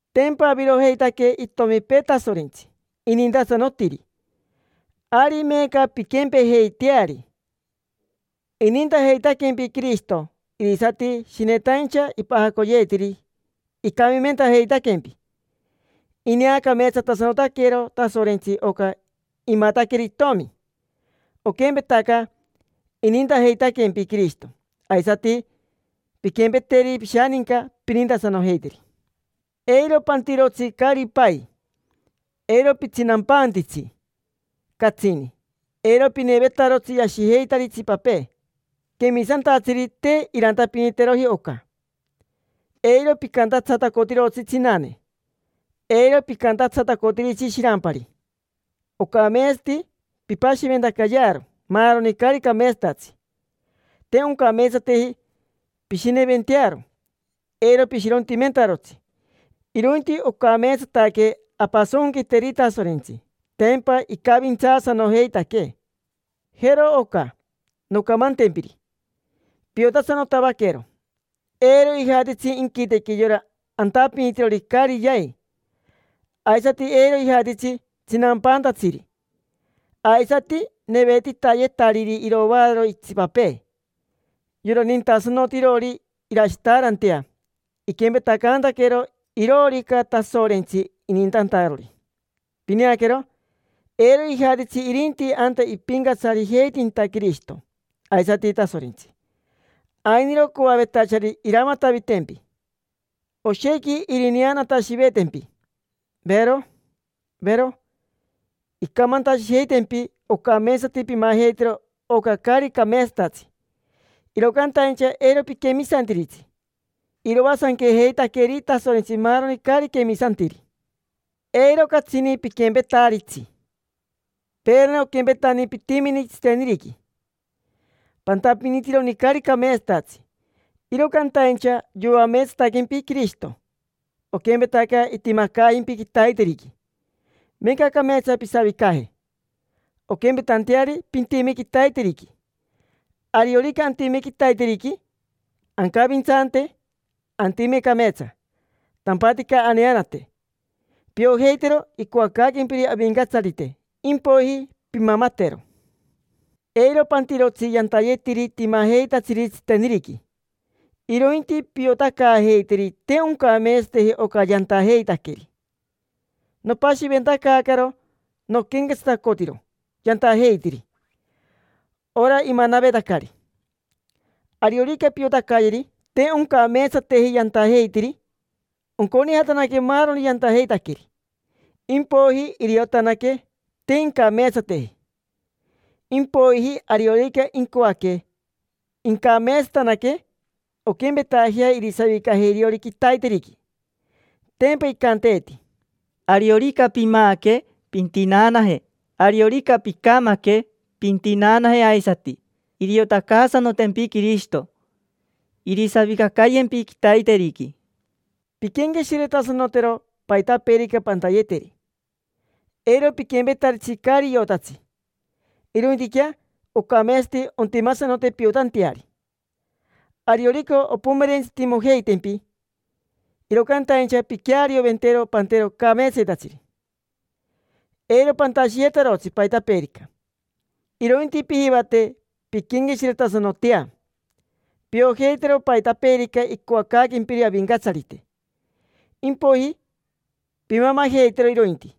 Tempa avirojeitaque itomipee Tasorentsi inintasanotiri: ari meeca pinquempejeiteari. Inintajeitaquempi Quirishito, irisati shinetaincha ipajacoyeetiri, icamimentajeitaquempi. Ineacameetsatasanotaquero Tasorentsi oca imataqueri itomi. Oquempetaca inintajeitaquempi Quirishito, aisati pinquempeteri pishaninca, pinintasanojeiteri. Eiro pantirotsi caari pai, eiro pitsinampantitsi catsini, eiro pinevetarotsi yashijeitari itsipapee: quemisantatsiri te irantapiniteroji oca. Eiro picantatsatacotirotsi tsinane, eiro pincantatsatacotiritsi shirampari. Ocameetsati pimpashiventacayearo maaroni caari cameetsatatsi. Te oncameetsateji pishineventearo, eiro pishirontimentarotsi. Irointi ocameetsataque ampasonquiteri Tasorentsi: tempa icavintsaasanojeitaquee. Jero oca noncamantempiri, piotasanotavaquero: eiro ijatitsi inquitequi yora antapinitirori caari yai, aisati eiro ijatitsi tsinampaantatsiri, aisati nevetitayetariri iroaararo itsipapee. Yora nintasanotirori irashitaarantea iquempetacantaquero iroorica Tasorentsi inintantarori. Pineaquero, eiro ijatitsi irinti anta ipincatsarijeitinta Quirishito aisati Tasorentsi. Ainiro coavetachari iramatavitempi: oshequi irineanatashivetempi, vero, vero. Incamantashijeitempi ocameetsati pimajeitero oca caari cameetsatatsi, iro cantaincha eiro piquemisantiritsi. Iroasanquejeitaqueri Tasorentsi maaroni caari quemisantiri. Eiro catsini piquempetaritsi. Peerani oquempetani pitimini tsiteniriqui: pantapinitironi caari cameetsatatsi. Iro cantaincha yoameetsataquempi Quirishito, oquempetaca itimacaajimpi quitaiteriqui. Meeca cameetsa pisavicaje, onquempetanteari pintime quitaiteriqui. Ariorica antime quitaiteriqui, ancavintsante, antime cameetsa, tampatica aneanate. Piojeitero icoacaaquempiri Avincatsarite, impoiji pimamatero. Eiro pantirotsi yantayetiri timajeitatsiri tsiteniriqui, irointi piotacaajeiteri te oncameetsateji oca yantajeitaqueri. Nopashiventacaacaro noquenquetsatacotiro yantajeitiri, ora imanavetacari. Ariorica piotacayeri te oncameetsateji yantajeitiri, onconijataque maaroni yantajeitaqueri. Impoiji iriotanaque te incameetsateji. Impoiji ariorica incoaque incameetsatanaque, onquempetajea irisavicaje iriori quitaiteriqui. Tempa icanteeti: “Ariorica pimaaque, pintinaanaje. Ariorica picamaque, pintinaanaje aisati. Iriotacaasanotempi Quirishito, irisavicacayempi quitaiteriqui”. Pinquenqueshiretasanotero paitapeerica pantayeteri: eiro piquempetaritsi caari iotatsi, irointiquea ocameetsati ontimasanote piotanteari. Ariorica ompomerentsitimojeitempi, iro cantaincha pinquearioventero pantero cameetsayetatsiri. Eiro pantashiyetarotsi paitapeerica, irointi pijivate pinquenqueshiretasanotea. Piojeitero paitapeerica icoacaaquempiri Avincatsarite: impoiji pimamajeitero irointi.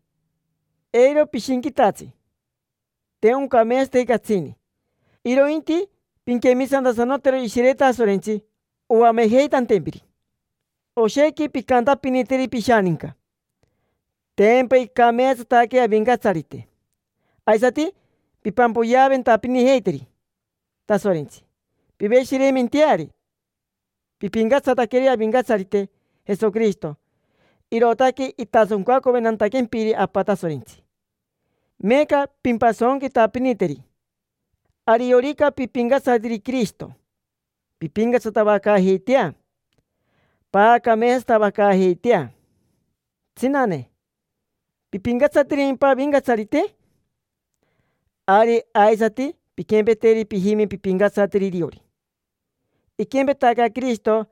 Eiro pishinquitatsi, te oncameetsateji catsini: irointi pinquemisantasanotero Ishire Tasorentsi oamejeitantempiri. Oshequi pincantapiniteri pishaninca: “Tempa icameetsataque Avincatsarite”, aisati pimpampoyeaventapinijeiteri Tasorentsi, piveshireimenteari. Pipincatsataqueri Avincatsarite Jesoquirishito, irootaque itasoncacoventantaquempiri Apa Tasorentsi. Meeca pimpasonquitapiniteri. Ariorica pipincatsatiri Quirishito, pimpincatsatavacaajeitea, paacameetsatavacaajeitea. Tsinane, ¿pipincatsatirimpa Avincatsarite? Ari, aisati pinquempeteri pijime, pimpincatsateri iriori. Iquempetaca Quirishito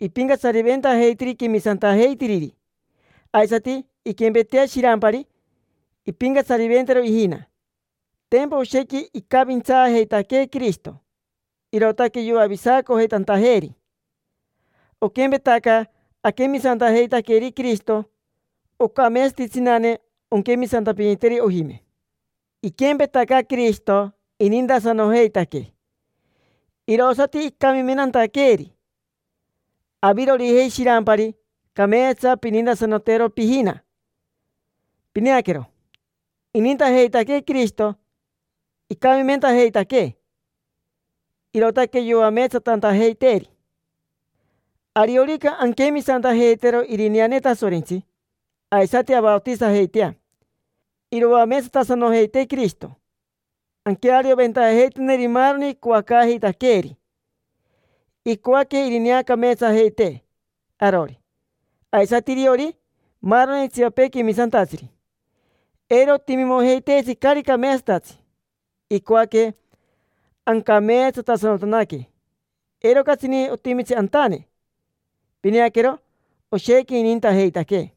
ipincatsariventajeitiri quemisantajeitiriri, aisati inquempetea shirampari, impincatsariventero ijina. Tempa oshequi icavintsaajeitaquee Quirishito, irootaque yoavisacojeitantajeeri. Oquempetaca aquemisantajeitaqueri Quirishito, ocameetsati tsinane onquemisantapiniteri ojime. Iquempetaca Quirishito inintasanojeitaquee, irosati icamimentantaqueeri, avirojei shirampari, cameetsa pinintasanotero pijina. Pineaquero, inintajeitaquee Quirishito, icamimentajeitaquee, irootaque yoameetsatantajeiteeri. Ariorica anquemisantajeitero irineane Tasorentsi aisati avaotisajeitea, iroameetsatasanojeitee Quirishito anquearioventajeiteneri maaroni icoacaajeitaqueeri. Icoaque irineacameetsajeitee arori, aisati iriori maaroni itsipapee quemisantatsiri; eiro otimimojeiteetsi caari cameetsatatsi. Icoaque ancameetsatasanotanaque, eiro catsini otimi antane. Pineaquero, oshequi inintajeitaquee.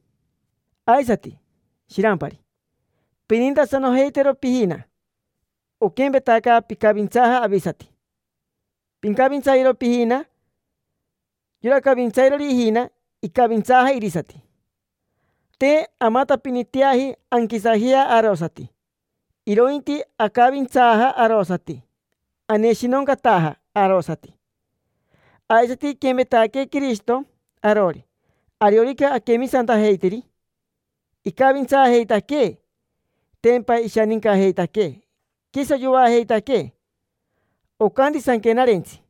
Aisati, shirampari, pinintasanojeitero pijina. Oquempetaca picavintsaaja avisati, pincavintsayero pijina. Yora cavintsairori ijina, icavintsaaja irisati. Te amatapiniteaji anquisajea arosati, irointi acavintsaaja arosati, aneshinoncataja arosati. Aisati, iquempetaquee Quirishito arori, ariorica aquemisantajeitiri, icavintsaajeitaquee; tempa ishanincajeitaquee, quiso yoajeitaquee. Ocanti Sanquenarentsi: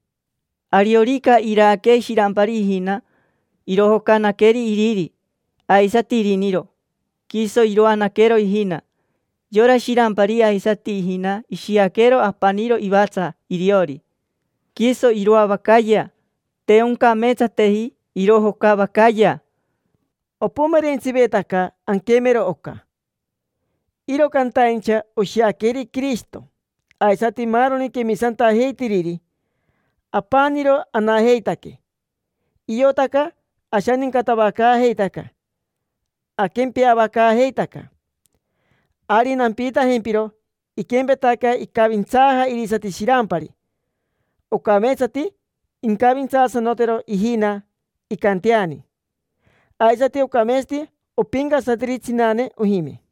“Ariorica iraaque shirampari ijina, irojocanaqueri iriri, aisati iriniro, quiso iroanaquero ijina. Yora shirampari aisati ijina ishiaquero apaniro ivatsa iriori: quiso iroavacayea, te oncameetsateji irojocavacayea”. Opomerentsivetaca anquemero oca, iro cantaincha oshiaqueri Quirishito aisati maaroni quemisantajeitiriri, apaniro anajeitaque: iotaca ashanincatavacaajeitaca, aquempeavacaajeitaca. Ari nampiitajempiro: iquempetaca icavintsaaja irisati shirampari, ocameetsati incavintsaasanotero ijina, incanteani. Aisati ocameetsati ompincatsateri tsinane ojime.